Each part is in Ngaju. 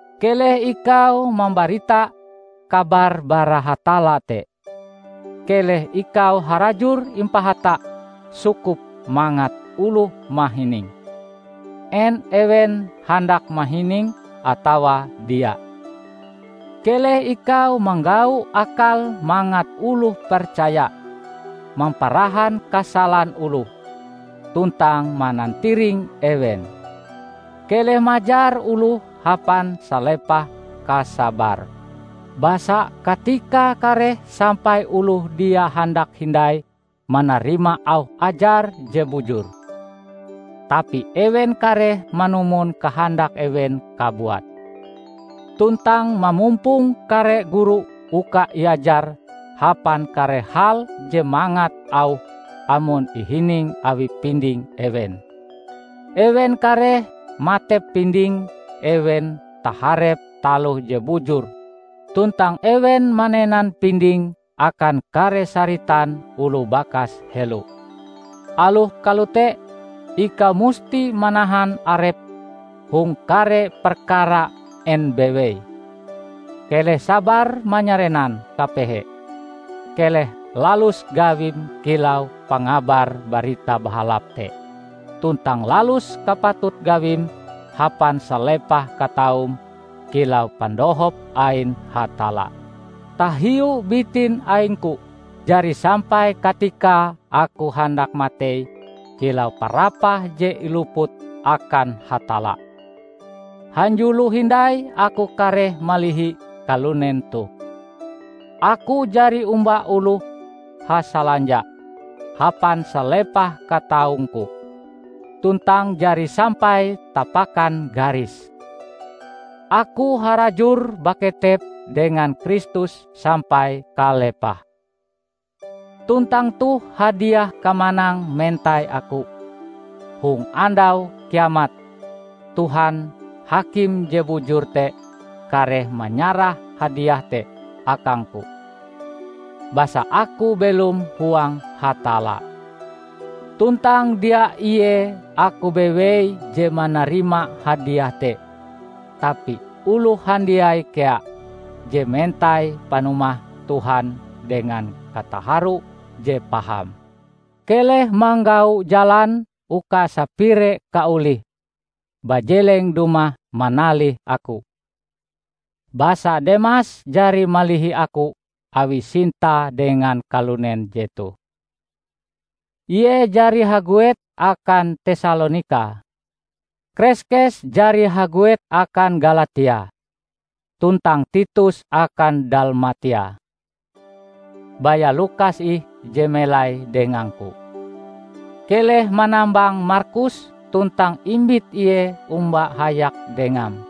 Keleh ikau mambarita kabar bara Hatalla te, keleh ikau harajur impahata sukup mangat oloh mahininge, en ewen handak mahininge atawa dia. Keleh ikau manggau akal mangat oloh percaya, mamparahan kasalan oloh, tuntang manantiring ewen. Keleh majar oloh hapan salepah kasabarm. Basa katikae kareh sampai oloh dia handak hindai manarima auh ajar je bujur. Tapi ewen kareh manumon kahandak ewen kabuat, tuntang mamumpong kare guru uka iajar hapan kare hal je mangat auhe amon ihining awi pinding ewen. Ewen kareh matep pinding ewen taharep taloh je bujur tuntang ewen manenan pindinge akan kare saritan oloh bakas helo. Aloh kalote, ikau musti manahan arepm hong kare perkara en bewei. Keleh sabar manyarenan kapehe, keleh lalus gawim kilau pangabar Barita Bahalap te tuntang lalus kapatut gawim hapan salepah kataum kilau pandohop ain Hatalla. Tahiu bitin aingku, jari sampai katikae aku handak matei kilau parapah je iluput akan Hatalla. Hanjulo hindai aku kareh malihi kalunen toh. Aku jari omba oloh hasalanja hapan salepah kataungku, tuntang jari sampai tapakan garis. Aku harajur baketep dengan Kristus sampai kalepahe. Tuntang toh hadiah kamanang mentai aku. Hong andau kiamat, Tuhan, Hakim je bujur te kareh manyarah hadiah te akangku, basa aku belom huang Hatalla. Tuntang dia ie aku bewei je manarima hadiah te, tapi oloh handiai kea je mentai panumah Tuhan dengan kataharo je paham. Keleh manggau jalan uka sapire kaolihm bajeleng dumah manalih aku, basa Demas jari malihi aku awi sintae dengan kalunen jetoh. Ie jari haguet akan Tesalonika. Kreskes jari haguet akan Galatia, tuntang Titus akan Dalmatia. Baya Lukas ih je melai dengangku. Keleh manambang Markus tuntang imbit ie omba hayak dengam,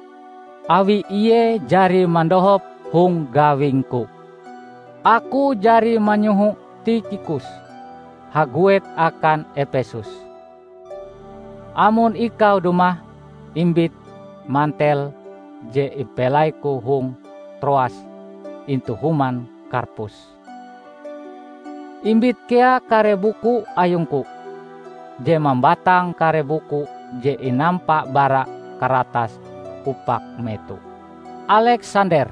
awi ie jari mandohop hong gawingku. Aku jari manyoho Tikhikus haguet akan Epesus. Amon ikau dumah, imbit mantel je impelaiku hong Troas intu human Karpus. Imbit kea kare buku ayungku, je mambatang kare buku je inampa bara karatas upak meto. Aleksander,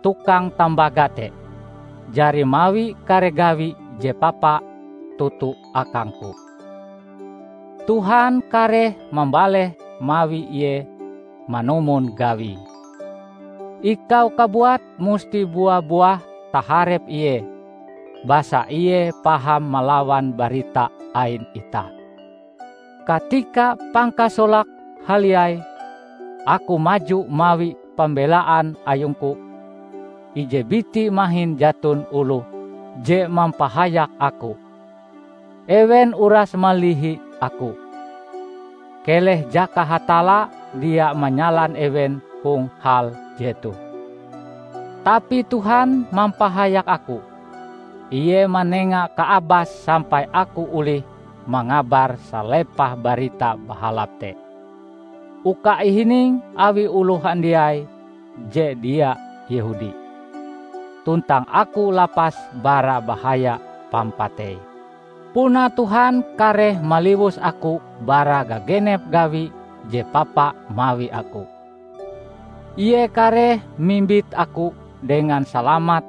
tukang tambaga te, jari mawi kare gawi je papa toto akangku. Tuhan kareh mambaleh mawi ie manumon gawie. Ikau kabuat musti bua-buah taharep ie basa ie paham malawan barita ain itah. Katika pangkasolake haliai aku maju mawi pambelaan ayungku, ije biti mahin jaton oloh je mampahayak aku; ewen uras malihi aku. Keleh jaka Hatalla dia manyalan ewen hong hal jetoh! Tapi Tuhan mampahayak aku. Ie manenga kaabas sampai aku olih mangabar salepah Barita Bahalap te, uka ihining awi oloh handiai je dia Yehudi. Tuntang aku lapas bara bahaya pampatei. Puna Tuhan kareh maliwus aku bara gagenep gawi je papa mawi aku. Ie kareh mimbit aku dengan salamat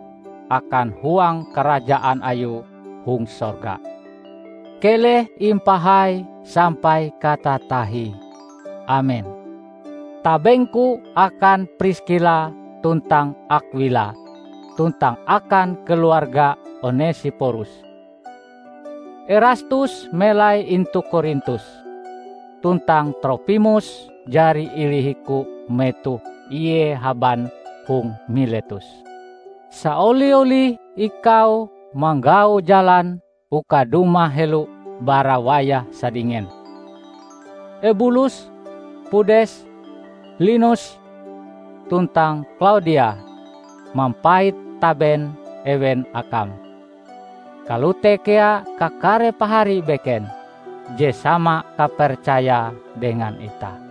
akan huang karajaan Ayue hong sorga. Keleh impahai sampai katatahie! Amen. Tabengku akan Priskila tuntang Akwila tuntang akan keluarga Onesiporus. Erastus melai intu Korintus, tuntang Tropimus jari ilihiku metoh ie haban hong Miletus. Saoli-olih ikau manggau jalan uka dumah helo bara wayah sadingen. Ebulus, Pudes, Linus, tuntang Klaudia mampait taben ewen akam; kalote kea kakare pahari beken je sama kapercayae dengan itah.